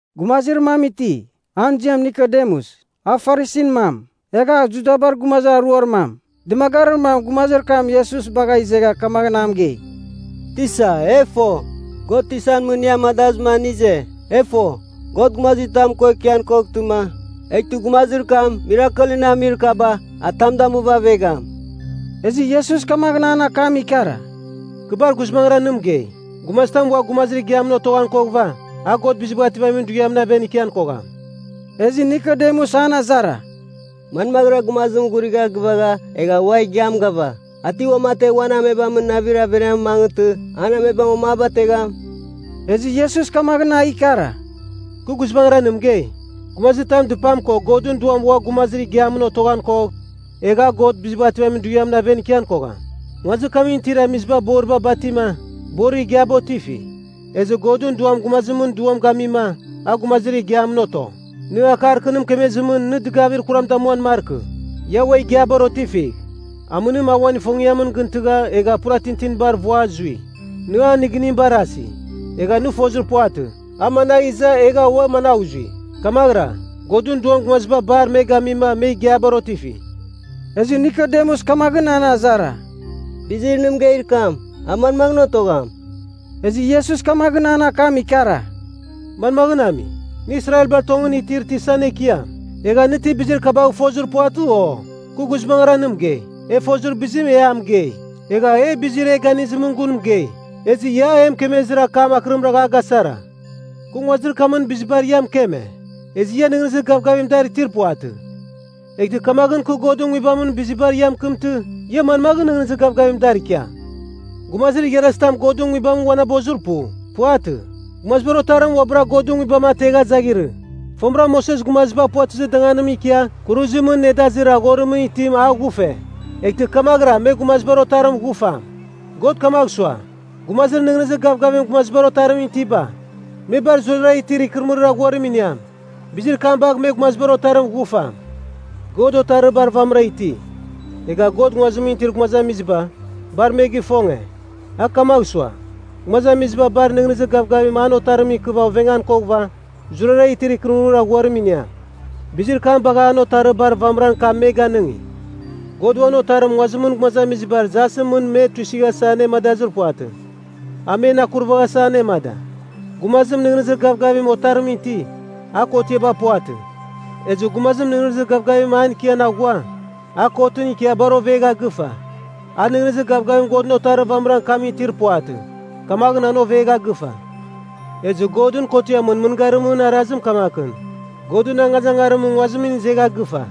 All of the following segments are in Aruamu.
Gumazir mam iti, an ziam Nikodemus, a Farisin mam, egha a Judabar gumazir aruar mam. Dɨmagarir mam gumazir kam Iesus bagha izegha kamaghɨn a mɨgei, “Tisa, e fo, God tisan mɨn nɨ amadazɨma nɨ ize. E fo, God gumazitam ko ikian koghtɨma, eghtɨ gumazir kam mirakelɨn nɨ amir kaba, a tam damuva avegham.” Ezɨ Iesus kamaghɨn an akam ikara, “Kɨ bar guizbangɨra nɨ mɨgei. Gumazitam ua gumazir igiamɨn otoghan koghɨva, a God Bizibagh Ativamin Dughiamɨn aven ikian kogham.” Ezɨ Nikodemus an azara, “Manmaghɨra gumazim ghurigha gɨvagha egha ua igiam gava? A ti uamategh uan amebamɨn navir averiamɨn mangɨtɨ an amebam uam a bategham?” Ezɨ Iesus kamaghɨn a ikara, “Kɨ guizbangɨra nɨ mɨgei, gumazitam dɨpam ko Godɨn Duamɨn ua gumazir igiamɨn otoghan kogh, egh a God Bizibagh Ativamin Dughiamɨn aven ikian kogham. Nguazir kamɨn itir amiziba boriba batima, borir igiaba otifi. Ezɨ Godɨn Duam gumazimɨn duam gamima, a gumazir igiamɨn oto. Nɨ akar kɨ nɨ mɨkemezimɨn nɨ dɨgavir kuram damuan markɨ, ‘Ia ua igiabar otifigh.’ Amɨnim a uan ifongiamɨn gɨn tɨgha egha pura tintinibar vua zui. Nɨ an nɨgɨnim barasi, egha nɨ fozir puvatɨ, a managh iza egha ua managh zui. Kamaghɨra, Godɨn Duam gumaziba bar me gamima me igiabar otifi.” Ezɨ Nikodemus kamaghɨn an azara, “Bizir nɨ mɨgeir kam, a manmaghɨn otogham?” Ezɨ Iesus kamaghɨn an akam ikara, “Manmaghɨn ami? Nɨ Israelbar tongɨn itir tisan ekiam, egha nɨ ti bizir kabagh fozir puvatɨ, o? Kɨ guizbangɨra nɨ mɨgei, e fozir bizim e a mɨgei. Egha e bizir e ganizimɨn gun mɨgei. Ezɨ ia, e mɨkemezir akam akɨrim ragha a gasara. Kɨ nguazir kamɨn bizibar ia mɨkeme, ezɨ ia nɨghnɨzir gavgavim dar itir puvatɨ. Eghtɨ kamaghɨn kɨ Godɨn Nguibamɨn bizibar ia mɨkɨmtɨ, ia manmaghɨn nɨghnɨzir gavgavim dar ikiam? Gumazir igharazitam Godɨn Nguibamɨn ghuavanabozir pu. Puvatɨ. Gumazibar Otarim uabɨra Godɨn Nguibam ategha zaghirɨ. “Fomɨra Moses gumaziba puvatɨzir danganimɨn ikia kuruzimɨn nedazir aghorimɨn itim a ghufe, eghtɨ kamaghɨra me Gumazibar Otarim ghufam. God kamagh sua, gumazir nɨghnɨzir gavgavim Gumazibar Otarimɨn itiba, me bar zurara itir ikɨrɨmɨrir aghuarim iniam. Bizir kam bagh me Gumazibar Otarim ghufam. “God Otarir bar vamɨra iti. Egha God nguazimɨn itir gumazamiziba, bar me gifonge. A kamagh sua, gumazamiziba bar nɨghnɨzir gavgavim an Otarimɨn ikɨva ovengan koghɨva, zurara itir ikɨrɨmɨrir aghuarim iniam. Bizir kam bagha an Otarir bar vamɨran kam me ganɨngi. God uan Otarim nguazimɨn gumazamizibar jasɨn mɨn me tuisɨghasa anemadazir puvatɨ. A men akurvaghasa anemada. Gumazim nɨghnɨzir gavgavim Otarimɨn ti, a kotiaba puvatɨ. Ezɨ gumazim nɨghnɨzir gavgavim an ikian aghua, a kotɨn ikia bar ovegha gɨfa. A nɨghnɨzir gavgavim Godɨn Otarir vamɨran kamɨn itir puvatɨ, kamaghɨn an ovegha gɨfa. Ezɨ Godɨn kotiamɨn mɨngarimɨn arazim kamakɨn, Godɨn angazangarim nguazimɨn izegha gɨfa.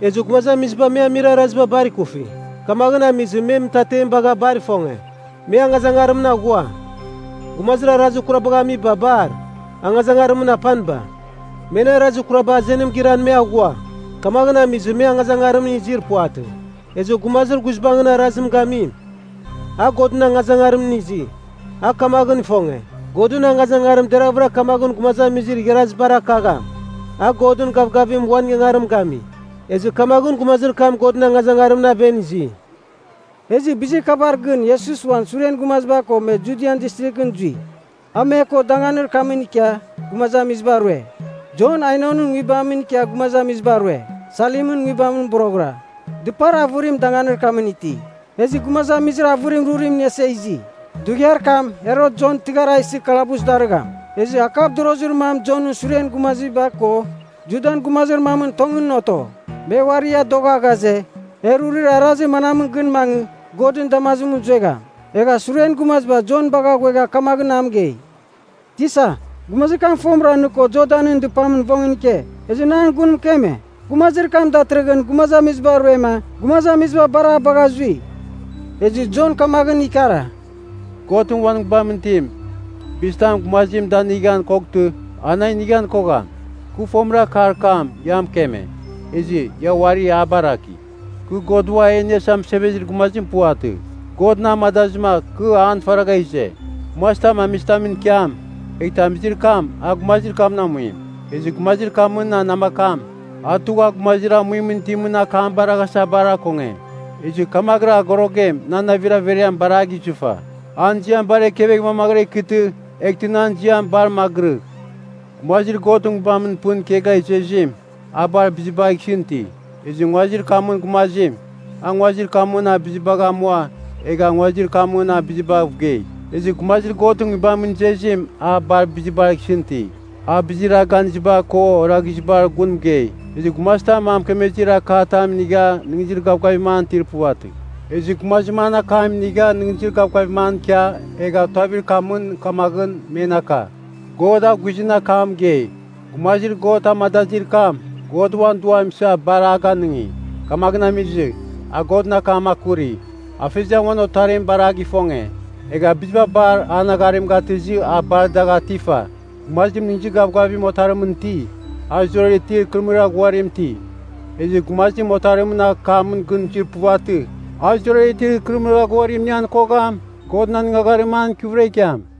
Ezɨ gumazamiziba, me amir araziba bar ikufi, kamaghɨn amizɨ me mɨtatem bagha bar ifonge, me angazangarimɨn aghua. Gumazir arazir kurabagh amiba bar, angazangarimɨn apaniba. Men arazir kuraba azenim giran me aghua, kamaghɨn amizɨ me angazangarimɨn izir puvatɨ. Ezɨ gumazir guizbangɨn arazim gamim, a Godɨn angazangarimɨn izi. A kamaghɨn ifonge, Godɨn angazangarim deravɨra kamaghɨn gumazamizir igharazibar akagham, a Godɨn gavgavimɨn uan ingangarim gami. Ezɨ kamaghɨn gumazir kam Godɨn angazangarimɨn aven izi.” Ezɨ bizir kabar gɨn Iesus uan suren gumaziba ko me Judian Distrighɨn zui. A me ko danganir kam ikia gumazamiziba rue. Jon Ainonɨn nguibamɨn ikia gumazamiziba rue, Salimɨn nguibamɨn boroghɨra. Dɨpar avɨrim danganir kamɨn ti, ezɨ gumazamizir avɨrim rurim iniasa izi. (Dughiar kam Herot Jon tɨghar a isɨ kalabus darɨgham.) Ezɨ akavdorozir mam Jonɨn suren gumaziba ko Judan gumazir mamɨn tongɨn oto. Me uari adogha ghaze, e rurir arazir manamɨn gɨn mangɨ, Godɨn damazim zuegham? Egha suren gumaziba Jon bagha ghuegha kamaghɨn a mɨgei, “Tisa, gumazir kam fomɨra nɨ ko Jordanɨn dɨpamɨn vongɨn ike, ezɨ nɨ an gun mɨkeme, gumazir kam datɨrɨghɨn gumazamiziba ruema, gumazamiziba bar a bagha zui.” Ezɨ Jon kamaghɨn ikara, “Godɨn uan Nguibamɨn itim, bizitam gumazim danigan koghtɨ, an a inighan kogham. Kɨ fomɨra akar kam ia mɨkeme, ezɨ ia uari a baraki, ‘Kɨ God Ua E Iniasa Mɨsevezir Gumazim puvatɨ. God na amadazɨma kɨ an faragha ize.’ Gumazitam amizitamɨn ikiam, eghtɨ amizir kam a gumazir kamɨn amuim. Ezɨ gumazir kamɨn namakam, a tugha gumazir amuimɨn itimɨn akam baraghasa bar akonge. Ezɨ kamaghɨra agorogem nan navir averiam bar a gizɨfa. An ziam bar ekevegh mamaghɨra ikɨtɨ, eghtɨ nan ziam bar magɨrɨgh. “Gumazir Godɨn Nguibamɨn pɨn ikegha izezim, a bar bizibagh isɨn iti. Ezɨ nguazir kamɨn gumazim, a nguazir kamɨn bizibagh amua egha nguazir kamɨn bizibav gei. Ezɨ gumazir Godɨn Nguibamɨn izezim a bar bizibar isɨn iti. A bizir a ganiziba ko oraghizibar gun mɨgei. Ezɨ gumazitam a mɨkemezir akar katam inigha nɨghnɨzir gavgavim an itir puvatɨ. Ezɨ gumazim an akam inigha nɨghnɨzir gavgavim an ikia, egha tuavir kamɨn kamaghɨn men aka, God a guizɨn akam mɨgei. Gumazir God amadazir kam, God uan Duam isa bar a ganɨngi. Kamaghɨn amizɨ, a Godɨn akam akuri. Afeziam uan Otarim bar a gifonge, egha biziba bar an agharim gatɨzɨ a bar dagh atifa. Gumazim nɨghnɨzir gavgavim Otarimɨn ti, a zurara itir ikɨrɨmɨrir aghuarim iti. Ezɨ gumazim Otarimɨn akamɨn gɨn zuir puvatɨ, a zurara itir ikɨrɨmɨrir aghuarim inian kogham, Godɨn anɨngagharim an ikɨvɨra ikiam.”